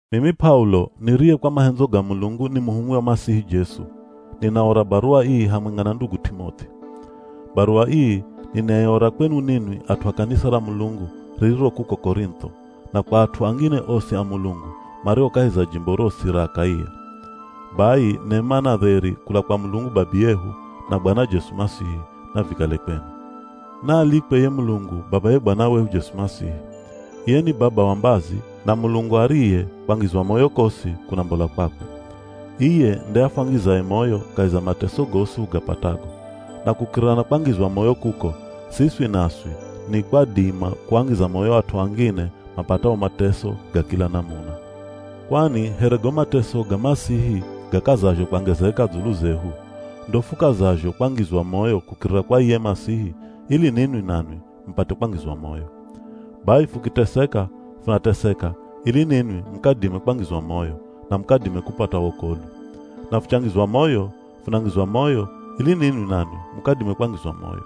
Mimi P'aulo niriye kwa mahendzo ga Mulungu ni muhumwi wa Masihi Jesu, ninaora baruwa ii hamwenga na ndugu T'imoth'i. Baruwa ii ninaiora kwenu ninwi at'u a kanisa ra Mulungu ririro kuko Korintho, na kwa at'u angine osi a Mulungu mario kahi za jimbo rosi ra Akaia. Bai nema na dheri kula kwa Mulungu Babiyehu, na Bwana Jesu Masihi, navikale kwenu. Naalikwe ye Mulungu Babaye Bwana wehu Jesu Masihi. Iye ni Baba wa mbazi, na Mulungu ariye kwangizwa moyo kosi kunambola kwakwe. Iye nde afwangizaye moyo kahi za mateso gosi hugapatago. Na kukirira na kwangizwa moyo kuko, siswi naswi ni kwadima kuangiza moyo at'u angine mapatao mateso ga kila namuna. Kwani here go mateso ga Masihi gakazazho kwangezeka dzulu zehu, ndo fukazazho kwangizwa moyo kukirira kwa iye Masihi ili ninwi nanwi mupate kwangizwa moyo. Bai fukiteseka, funateseka ili ninwi mukadime kwangizwa moyo, na mukadime kupata wokolwi. Na fuchangizwa moyo, funangizwa moyo ili ninwi nanwi mukadime kwangizwa moyo.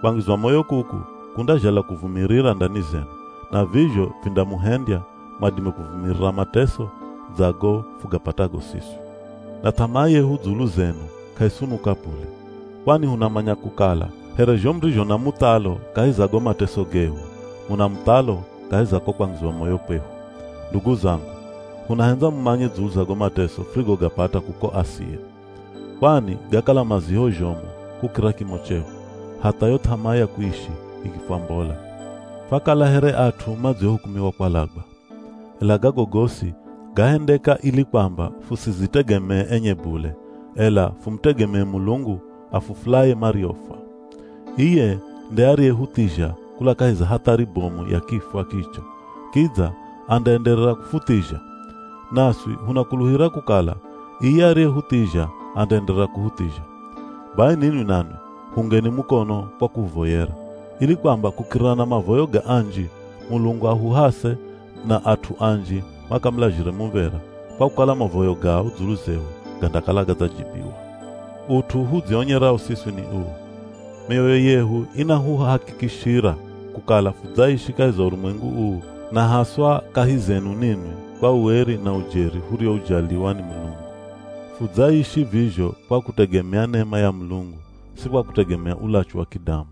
Kwangizwa moyo kuku kundazhala kuvumirira ndani zenu, na vizho vindamuhendya mwadime kuvumirira mateso dza go fugapatago siswi. Na th'amaa yehu dzulu zenu k'aisunuka bule, kwani hunamanya kukala here zho murizho na muthalo kahi za go mateso gehu, muna muthalo kahi za ko kwangizwa moyo kwehu. Ndugu zangu, hunahendza mumanye dzulu za go mateso furigogapata kuko Asia. Kwani gakala maziho zhomu kukira kimo chehu, hatha yo th'amaa ya kuishi ikifwambola. Fakala here at'u madziohukumiwa kwalagwa. Ela gago gosi gahendeka ili kwamba fusidzitegemee enye bule, ela fumutegemee Mulungu afufulaye mariofwa. Iye nde ariyehuthizha kula kahi za hathari bomu ya kifwa kicho, kidza andaenderera kufuthizha. Naswi hunakuluhira kukala iye ariyehuthizha andaenderera kuhuthizha. Bai ninwi nanwi huungeni mukono kwa kuhuvoyera, ili kwamba kukirira na mavoyo ga anji, Mulungu ahuhase, na at'u anji makamulazhire muv̱era kwa kukala mavoyo gao dzulu zehu gandakala gadzajibiwa. Ut'u hudzionyerao siswi ni uu; mioyo yehu inahuhakikishira kukala fudzaishi kahi za urumwengu uu na haswa kahi zenu ninwi kwa ueri na ujeri hurioujaliwa ni Mulungu. Fudzaishi vizho kwa kutegemea nema ya Mulungu si kwa kutegemea ulachu wa kidamu!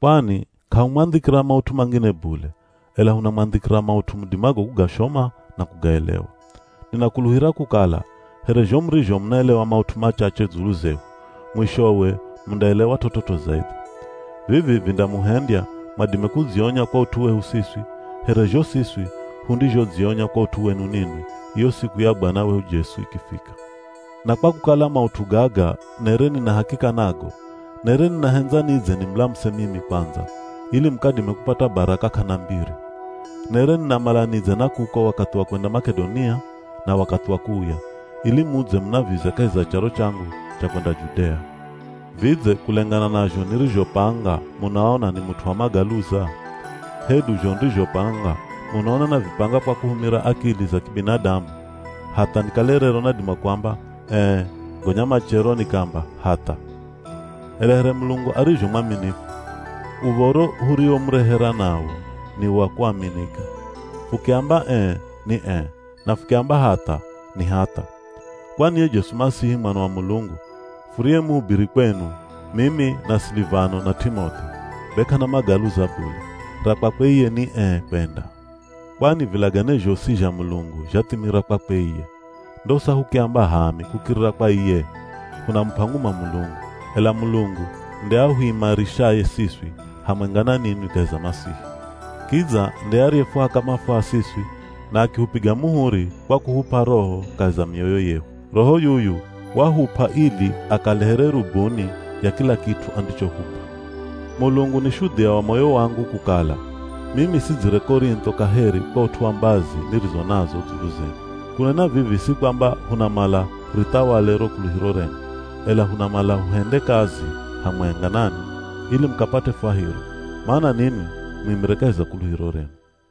Kwani k'ahumwandhikira maut'u mangine bule, ela hunamwandhikira maut'u mudimago kugashoma na kugaelewa. Ninakuluhira kukala here zho murizho munaelewa maut'u machache dzulu zehu, mwishowe mundaelewa t'ot'ot'o zaidhi. Vivi vindamuhendya mwadime kudzionya kwa ut'u wehu siswi, here zho siswi hundizhodzionya kwa ut'u wenu ninwi iyo siku ya Bwana wehu Jesu ikifika. Na kwa kukala maut'u gaga nere nina hakika nago, nere ninahendza nidze nimulamuse mimi kwandza ili mukadime kupata baraka k'ana mbiri. Nere ninamala nidze na kuko wakathi wa kwenda Mak'edonia na wakathi wa kuuya, ili mudze munavize kahi za charo changu cha kwenda Judea. Vidze kulengana na zho nirizhopanga munaona ni mut'u wa magaluza? Hedu zho nirizhopanga munaona navipanga kwa kuhumira akili za kibinadamu hatha nikale rero nadima kuamba “Ee,” gonya machero nikaamba “Hatha?” Ela here Mulungu arizho mwaminifu, uv̱oro huriomurehera nawo ni wa kuaminika. Fukiamba “Ee” ni ee, na fukiamba “Hatha” ni hatha. Kwani ye Jesu Masihi Mwana wa Mulungu, furiyemuhubiri kwenu mimi na Silivano na T'imoth'i, be k'ana magaluza bule, ra kwakwe iye ni ee kwenda. Kwani vilagane zhosi zha Mulungu zhathimira kwakwe iye. Ndosa hukiamba h'aami kukirira kwa iye, hunamup'a nguma Mulungu. Ela Mulungu nde ahuimarishaye siswi hamwenga na ninwi kahi za Masihi. Kidza nde ariyefuhaka mafuha siswi, na akihupiga muhuri kwa kuhup'a Roho kahi za mioyo yehu. Roho yuyu wahup'a ili akale here rubuni ya kila kit'u andichohup'a. Mulungu ni shudhia wa moyo wangu kukala, mimi sidzire Korintho kaheri kwa ut'u wa mbazi nirizo nazo dzulu zenu. Kunena vivi si kwamba hunamala hurithawale ro kuluhiro renu, ela hunamala huhende kazi hamwenga nanwi ili mukapate fwahiro; mana ninwi muimire kahi za kuluhiro renu.